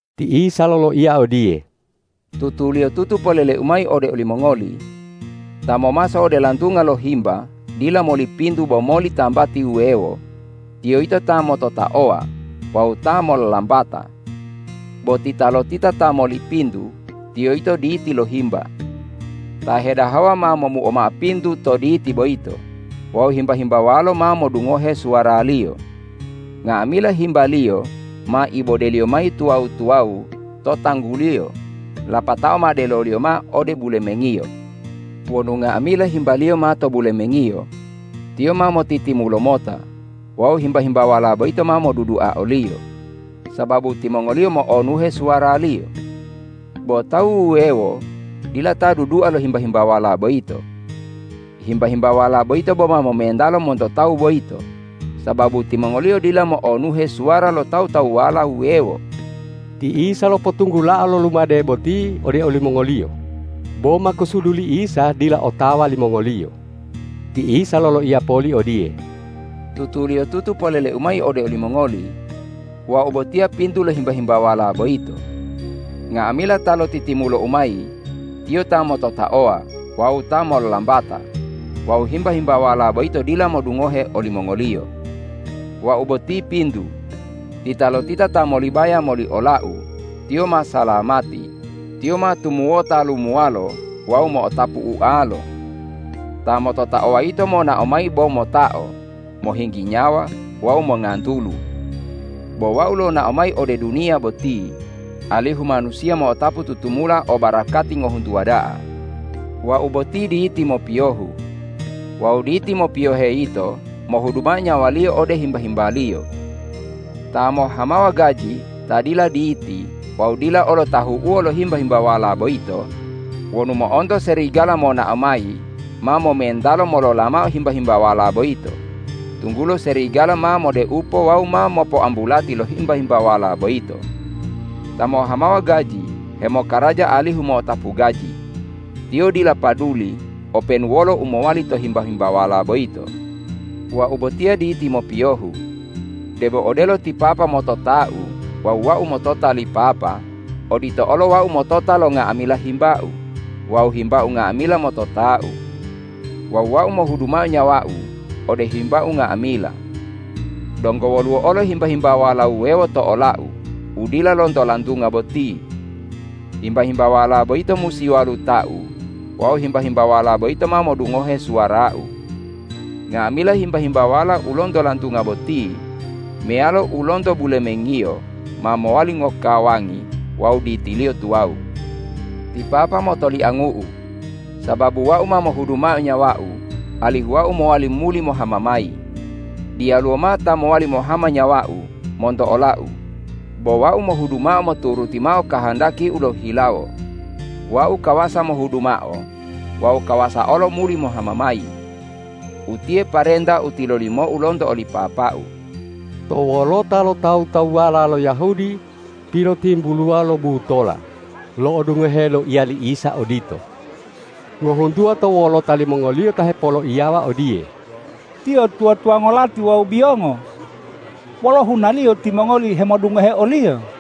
Ti Isa loloiya odiye,”Tutuliyotutu polele-U mayi ode olimongoli: Ta momaso ode lantunga lo himba dila moli pintu bo moli tambati wuwewo, tiyo yito ta mototaowa wawu ta mollambata. Bo titalotita ta moli pintu, tiyo yito diti lo himba. Ta hedahawa ma momuo mao pintu to diti boyito wawu himba-himbawalo ma modungohe suwaraliyo. Nga'amila himbaliyo ma ibodeliyo mayi tuwawu-tuwawu to tangguliyo lapatao ma deloliyo mao ode bulemengiyo. Wonu nga'amila himbaliyo ma to bulemengiyo, tiyo ma motitimulo mota wawu himba-himbawala boyito ma modudua oliyo, sababu timongoliyo mo'onuhe suwaraliyo. Bo tawu wuwewo dila ta dudua lo himba-himbawala boyito. Himba-himbawala boyito boma momentalo monto tawu boyito, sababu timongoliyo dila mo'onuhe suwara lo tawu-tawuwala wuwewo.” Ti Isa lopotunggulao lo lumade boti ode olimongoliyo, bo makusudu li Isa dila otawa limongoliyo. Ti Isa loloiya poli odiye,”Tutuliyotutu polele-U mayi ode olimongoli: Wau botiya pintu lo himba-himbawala boyito. Nga'amila ta lotitimulo-U mayi tiyo ta mototaowa wawu ta mollambata wawu himba-himbawala boyito dila modungohe olimongoliyo. Wau boti pintu. Titalotita ta molibaya moli ola-U, tiyo ma salamati; tiyo ma tumuwota lumuwalo wawu mo'otapu ualo. Ta mototaowa yito monao mayi bo motao, mohinggi nyawa wawu mongantulu. Bo Wau lonao mayi ode duniya boti, alihu manusiya mo'otapu tutumula o barakati ngohuntuwa da'a. Wau boti diti mopiyohu. Wawu diti mopiyohe yito mohudu mao nyawaliyo ode himba-himbaliyo. Ta mohhamawa gaji ta dila diti wawu dila olo tahu'uwo lo himba-himbawala boyito wonu mo'onto serigala monao mayi ma momentalo molola mao himba-himbawala boyito, tunggulo serigala ma modeupo wawu ma mopoambulati lo himba-himbawala boyito. Ta mohhamawa gaji hemokaraja alihu mo'otapu gaji. Tiyo dila paduli openu wolo u mowali to himba-himbawala boyito. Wau botiya diti mopiyohu. Debo odelo ti Papa motota-U wawu Wau motota li Papa, odito olo Wau motota lo nga'amila himba-U wawu himba-U nga'amila motota-U. Wawu Wau mohudu mao nyawa-U ode himba-U nga'amila. Donggo woluwo olo himba-himbawala wuwewo to ola-U u dila lonto lantunga boti. Himba-himbawala boyito musi waluta-U wawu himba-himbawala boyito ma modungohe suwara-U. Nga'amila himba-himbawala u lonto lantunga boti meyalo u lonto bulemengiyo, ma mowali ngokawangi wawu ditiliyo tuwawu. Ti Papa motoliangu-U, sababu Wau ma mohudu mao nyawa-U alihu Wau mowali muli mohama mayi. Diyaluwo mao ta mowali mohama nyawa-U monto ola-U, bo Wau mohudu mao moturuti mao kahandaki-U lohihilawo. Wau kawasa mohudu mao wawu kawasa olo muli mohama mayi. Utiye parenta u tilolimo-U lonto oli Papa-U.” To wolota lo tawu-tawuwala lo Yahudi pilotimbuluwa lo butola lo'odungohe loiya li Isa odito. Ngohuntuwa to wolota limongoliyo ta hepoloiyawa odiye,”Tiyo tuwa-tuwango lati wawu biyongo! Wolo hunaliyo timongoli hemodungohe o-Liyo?”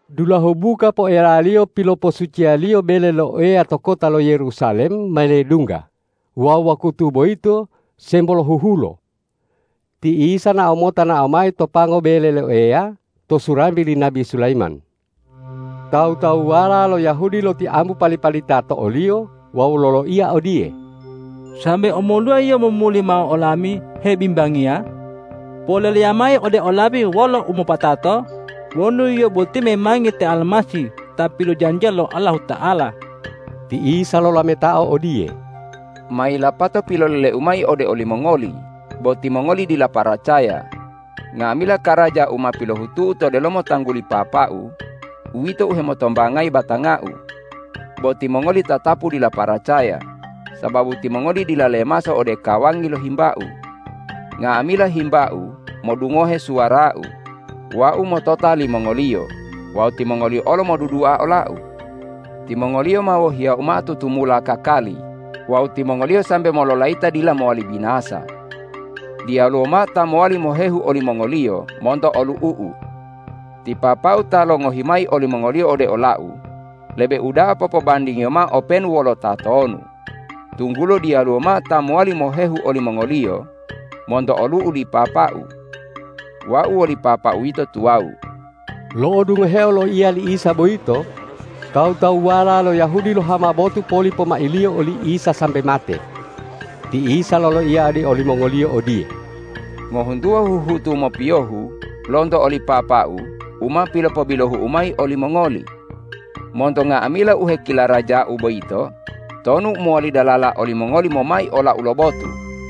Dulahu buka poelaliyo piloposuciyaliyo bele lo Eya to kota lo Yerusalem ma ledungga wawu wakutu boyito sembo lohuhulo. Ti Isa nao mota nao mayi to pango bele lo Eya to surambe li nabi Sulayiman. Tawu-tawuwala lo Yahudi lotiambu pali-palita to o-Liyo wawu loloiya odiye,”Sambe omoluwa Yio momuli mao olami hebimbangiya? Poleleya mayi ode olami wolo umopatato wonu Yio boti memangi te Almasih ta pilojanjiya lo Allahuta'ala.” Ti Isa lolametao odiye,”Ma yilapato pilolele-U mayi ode olimongoli, bo timongoli dila paracaya. Nga'amila karaja u ma pilohutu-U to delomo tangguli Papa-U, uwito u hemotombangayi batanga-U. Bo timongoli tatapu dila paracaya, sababu timongoli dila lemaso ode kawangi lo himba-U. Nga'amila himba-U modungohe suwara-U. Wau motota limongoliyo wawu timongoliyo olo modudua ola-U. Timongoliyo ma wohiya-U mao tutumula kakali wawu timongoliyo sambe mololayita dila mowali binasa. Diyaluwo mao ta mowali mohehu olimongoliyo monto olu'u-U. Ti Papa-U ta longohi mayi olimongoliyo ode ola-U, lebe uda'a popobandingiyo mao openu wolo tatonu, tunggulo diyaluwo mao ta mowali mohehu olimongoliyo monto olu'u li Papa-U. Wau woli Papa-U yito tuwawu.” Lo'odungoheo loiya li Isa boyito, tawu-tawuwala lo Yahudi lohama botu poli pomailiyo oli Isa sambe mate. Ti Isa loloiya ode olimongoliyo odiye,”Ngohuntuwa huhutu mopiyohu lonto oli Papa-U u ma pilopobilohu-U mayi olimongoli. Monto nga'amila u hekilaraja-U boyito, tonu u mowali dalala olimongoli momai ola-U lo botu?”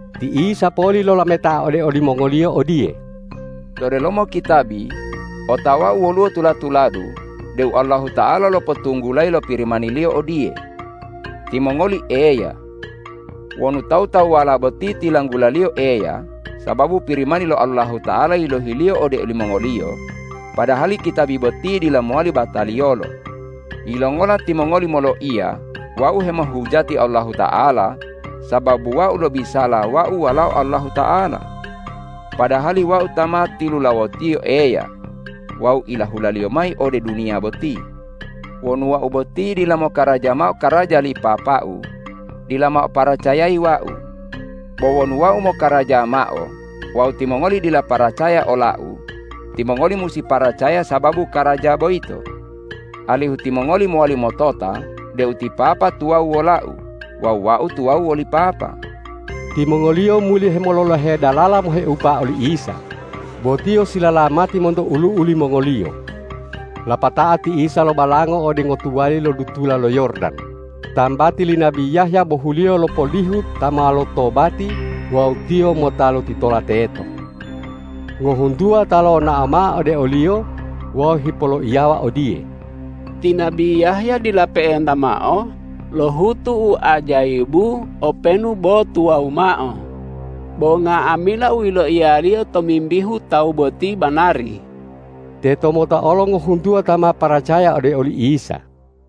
Ti Isa poli lolameta ode olimongoliyo odiye,”To delomo kitabi otawa-U woluwo tula-tuladu deu Allahuta'ala lopotunggulayi lo Pirimani-Liyo odiye, ’Timongoli eya.’ Wonu tawu- tawuwala boti tilanggulaliyo eya, sababu Pirimani lo Allahuta'ala yilohiliyo ode olimongoliyo, padahali kitabi boti dila mowali bataliyolo, yilongola timongoli moloiya Wau hemohujati Allahuta'ala sababu Wau lobisala Wau Walao Allahuta'ala? Padahali Wau ta ma tilulawotiyo Eya wawu ilahula-Liyo mayi ode duniya boti. Wonu Wau boti dila mokaraja mao karaja li Papa-U, dila mao paracayayi Wau. Bo wonu Wau mokaraja mao wawu timongoli dila paracaya ola-U, timongoli musi paracaya sababu karaja boyito, alihu timongoli mowali motota deu ti Papa tuwawu wola-U wawu Wau tuwawu woli Papa.” Timongoliyo muli hemololohe dalala moheupa oli Isa, bo Tiyo silalamati monto ulu'u limongoliyo. Lapatao ti Isa lobalangao ode ngotuwali lo dutula lo Yordan, tambati li nabi Yahya bohuliyo lopolihu ta ma lotobati wawu Tiyo mota lotitola teto. Ngohuntuwa ta lonao mao ode o-Liyo wawu hipoloiyawa odiye,”Ti nabi Yahya dila pe'enta mao lohutu u ajayibu openu bo tuwawu mao, bo nga'amila u yiloiyaliyo tomimbihu Tawu boti banari.” Tetomota olo ngohuntuwa ta ma paracaya ode oli Isa.